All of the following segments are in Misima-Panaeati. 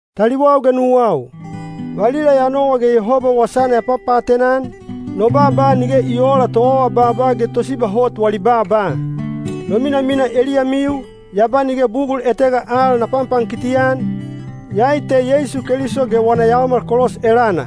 Taliwau ge nuwau, valila ya nowa ge Yehoba wasana ya papaatena-an, no baaba nige i oola toawabaaba ge tosiba hot wali baaba. No minamina eliyamiu, ya ba nige bugul etega al na panpankiti-an, iyai te Yeisu Keliso ge wana yaomal kolos elana.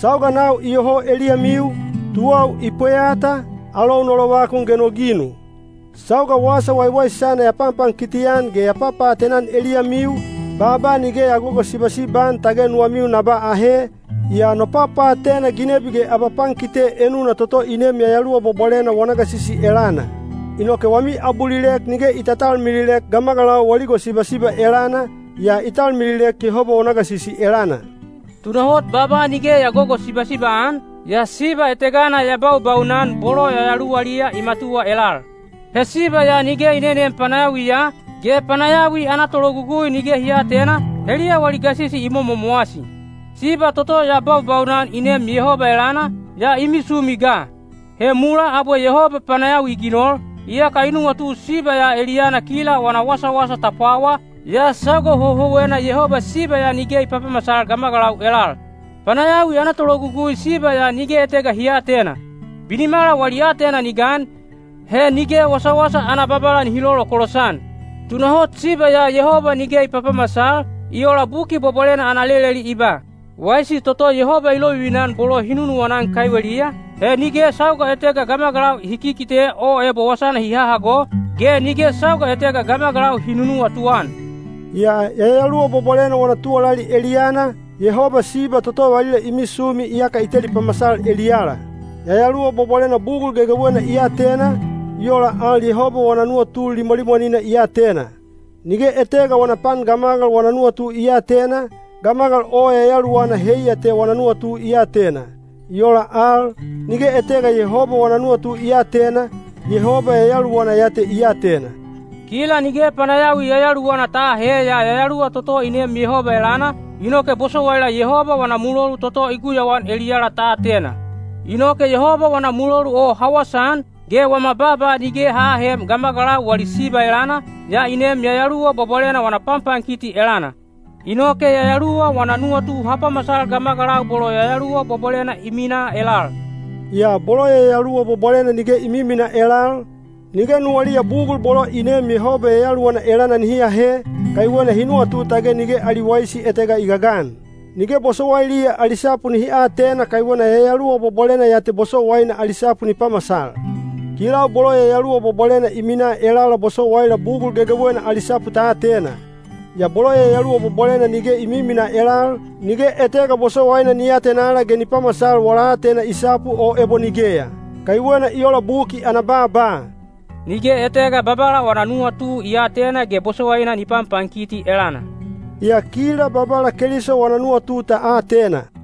Sauga nau iyoho eliyamiu, tuwau i pweyata, alou no lovakun ge no ginu. Sauga Wasa Waiwaisana ya panpankiti-an ge ya papaatena-an eliyamiu, baaba nige ya gogosibasiba-an tage nuwamiu na ba ahe, yaa no papaatena ginebi ge abapankite enuna toto i neem Yayaluwa Bwabwalena wana gasisi elana. Inoke wami abulilek nige i tatalmililek gamagalau wali gosibasiba elana, yaa i talmililek Yehoba wana gasisi elana. Tunahot baaba nige ya gogosibasiba-an, yaa siba etegana ya baubaunan bolo yayaluwaliya i matuwa elal. He siba ya nige i neneem panayawiya, ge panayawi ana tologugui nige hi aatena, heliya wali gasisi i momomowasi. Siba toto ya baubaunan i neem Yehoba elana, yaa i misumi ga. He mulaa abwe Yehoba panayawi i ginol, iyaka i nuwatu siba ya eliyana kila wana wasawasa ta pwawa, yaa sauga houhouwena Yehoba siba ya nige i papamasal gamagalau elal. Panayawi ana tologugui siba ya nige etega hi aatena. Binimala wali aatena ni gan, he nige wasawasa ana Babala nihi lolokolos-an. Tunahot siba ya Yehoba nige i papamasal, i ola Buki Bwabwalena ana leleli i ba, “Waisi toto Yehoba i lovivina-an bolo hi nunuwana-an kaiweliya, he nige sauga etega gamagalau hi kikite o ebo wasana hi hahago, ge nige sauga etega gamagalau hi nunuwatu-an.” Yaa Yayaluwa Bwabwalena wana tuwalali eliyana, Yehoba siba toto valila i misumi iyaka i teli pamasal eliyala. Yayaluwa Bwabwalena bugul gegewena i atena, i ola al Yehoba wana nuwatu limwalimwanina i atena. Nige etega wana pan gamagal wana nuwatu i aatena, gamagal o yayaluwana heiya te wana nuwatu i atena. I ola al, nige etega Yehoba wana nuwatu i aatena, Yehoba Yayaluwana ya te i atena. Kila nige panayawi yayaluwana ta aahe yaa Yayaluwa toto i neem Yehoba elana, inoke bosowaila Yehoba wana mulolu toto i guyauan eliyala ta atena. Inoke Yehoba wana mulolu o ha wasaan, ge wama baaba nige ha aahem gamagalau wali siba elana, yaa i neem Yayaluwa Bwabwalena wana panpankiti elana. Inoke Yayaluwa wana nuwatu ha pamasal gamagalau bolo Yayaluwa Bwabwalena i minaa elal. Yaa bolo Yayaluwa Bwabwalena nige i miminaa elal, nige nuwaliya bugul bolo i neem Yehoba Yayaluwana elana nihi ahe, kaiwena hi nuwatu tage nige ali waisi etega i gagan. Nige bosowailiya ali sapu nihi atena kaiwena Yayaluwa Bwabwalena ya te bosowaina ali sapu ni pamasal. Kilau bolo Yayaluwa Bwabwalena i minaa elala bosowaila bugul gegewena ali sapu ta atena. Yaa bolo Yayaluwa Bwabwalena nige i miminaa elal, nige etega bosowaina ni atenala ge ni pamasal wala aatena i sapu o ebo nigeya. Kaiwena i ola Buki ana baaba, “Nige etega Babala wana nuwatu i aatena ge bosowaina ni panpankiti elana.” Yaa kila Babala Keliso wana nuwatu ta atena.